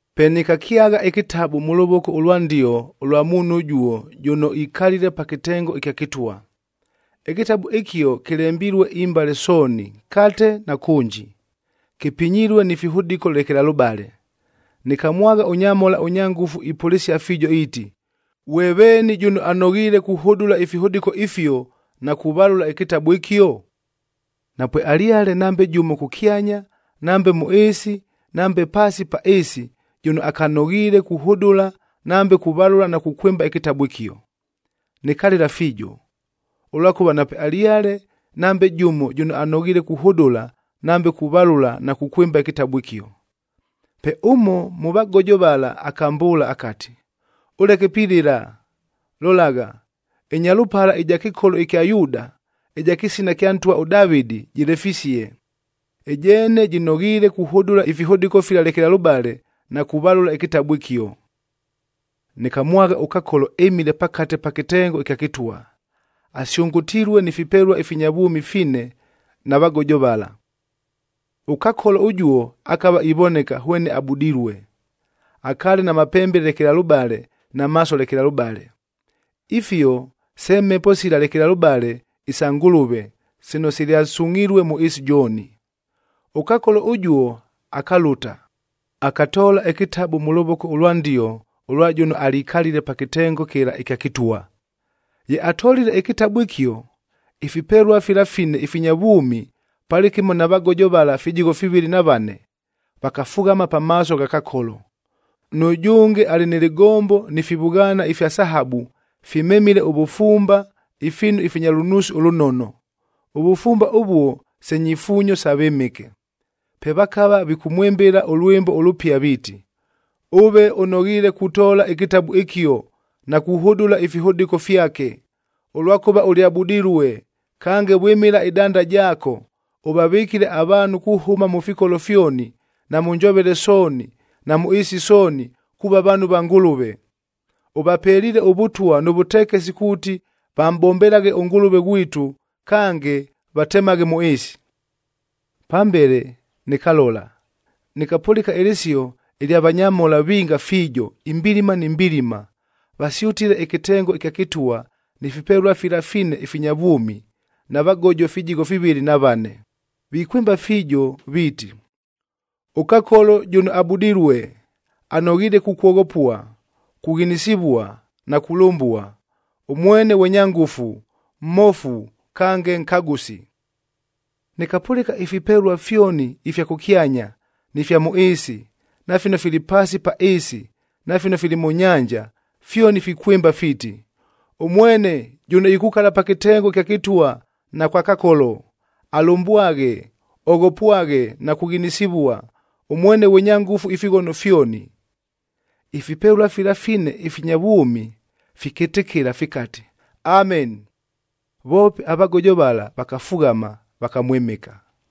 Pe nɨkakyagha ɨkɨtabu mʉ lovoko ʉlwa ndio ʉlwa muunhu ʉjuo jʉno ikalile pa kɨtengo ɨkya kɨtwa. Ɨkɨtabu ɨkio kɨlembilue imbale sooni, nkate na kʉnji, kɨpinyilue ni fihʉdɨkoa lekelalʉbale. Nɨkamwagha ʉnyamhola, ʉnya ngʉfu ipʉlɨsia fiijo iiti, “Ghwe veeni jʉno anoghiile kuhʉdʉla ifihʉdɨko ifio na kuvalʉla ɨkɨtabu ɨkio?” Napwealyale nambe jʉmo kʉkyanya, nambe mʉ ɨɨsi, nambe paasi pa ɨɨsi jʉno akanoghiile kuhʉdʉla nambe kuvalʉla na kukwɨmba ɨkɨtabu ɨkio. Nɨkalɨla fiijo, ʉlwakʉva napwealyale nambe jʉmo jʉno anoghiile kuhʉdʉla nambe kuvalʉla na kukwɨmba ɨkɨtabu ɨkio. Pe ʉmo mʉ vagojo vala akambʉʉla akati, “Ʉleke pilɨla! Lolagha, ɨNyalʉpala ɨja kɨkolo kya Yuuda,b ɨja kɨsina kya ntwa ʉDavɨdi jɨlefisie. Ɨjeene jɨnoghiile kuhʉdʉla ifihʉdɨko fila lekelalʉbale na kuvalʉla ɨkɨtabu ɨkio.” Nɨkamwagha ʉKakoloc ɨmile pakate pa kɨtengo ɨkya kɨtwa, asyʉngʉtilue ni fipelua ifinya vwʉmi fine na vagojo vala. ɄKakolo ʉjuo akava ivoneka hwene abudilue. Akaale na mapembe lekelalʉbale na maaso lekelalʉbale. Ifio se Mhepo sila lekelalʉbale isa Ngʉlʉve sino silyasungʼhilue mʉ ɨɨsi jooni. ɄKakolo ʉjuo akalʉta, akatoola ɨkɨtabu mʉ lʉvoko ʉlwa ndio ʉlwa jʉno alikalile pa kɨtengo kɨla ɨkya kɨtwa. Ye atolile ɨkɨtabu ɨkio, ifipelua fila fine ifinya vwʉmi palɨkɨmo na vagojo vala fijigho fivɨlɨ na vane vakafughama pamaaso gha Kakolo. Nʉjʉnge alɨ nɨ lɨgombo ni fivʉghaana ifya sahabu, fimemile ʉvʉfumba ifiinu ifinya lʉnuusi ʉlʉnono. Ʉvʉfumba ʉvuo se nyifuunyo sa vɨmɨke. Pe vakava vikʉmwɨmbɨla ʉlwɨmbo ʉlʉpia viiti, “Ʉve ʉnoghiile kutoola ɨkɨtabu ɨkio na kuhʉdʉla ifihʉdɨko fyake, ʉlwakʉva ʉlyabudilue, kange vwɨmɨla ɨdanda jaako, ʉvavɨkile avaanhu kuhʉma mʉ fikolo fyoni, na mʉ njovele sooni na mʉ ɨɨsi sooni kuuva vaanhu va Ngʉlʉve. Ʉvapeliile ʉvʉtwa nʉ vʉtekesi kuuti vamʼbombelaghe ʉNgʉlʉve ghwitu, kange vatemaghe mʉ ɨɨsi.” Pambele nɨkalola, nɨkapʉlɨka ɨlɨsio ɨlya vanyamhola vinga fiijo, imbilima ni mbilima, vasyʉtile ɨkɨtengo ɨkya kɨtwa ni fipelua fila fine ifinya vwʉmi na vagojo fijigho fivɨlɨ na vane, vikwɨmba fiijo viiti, “ɄKakolo jʉno abudilue, anoghiile kukwoghopua, kughinisivua na kulʉmbua, ʉmwene ghwe nya ngʉfu, mmofu kange nkagʉsi.” Nɨkapʉlɨka ifipelua fyoni ifya kʉkyanya, ni fya mʉ ɨɨsi, na fino fili paasi pa ɨɨsi na fino fili mʉ nyanja, fyoni fikwɨmba fiiti, “Ʉmwene jʉno ikukala pa kɨtengo ɨkya kɨtwa na kwa Kakolo, alʉmbwaghe, oghopwaghe na kughinisivua, ʉmwene ghwe nya ngʉfu ifighono fyoni!” Ifipelua fila fine ifinya vwʉmi fikɨtɨkɨla fikati, “Ameni!” Voope avagojo vala vakafughama, vakamwɨmɨka.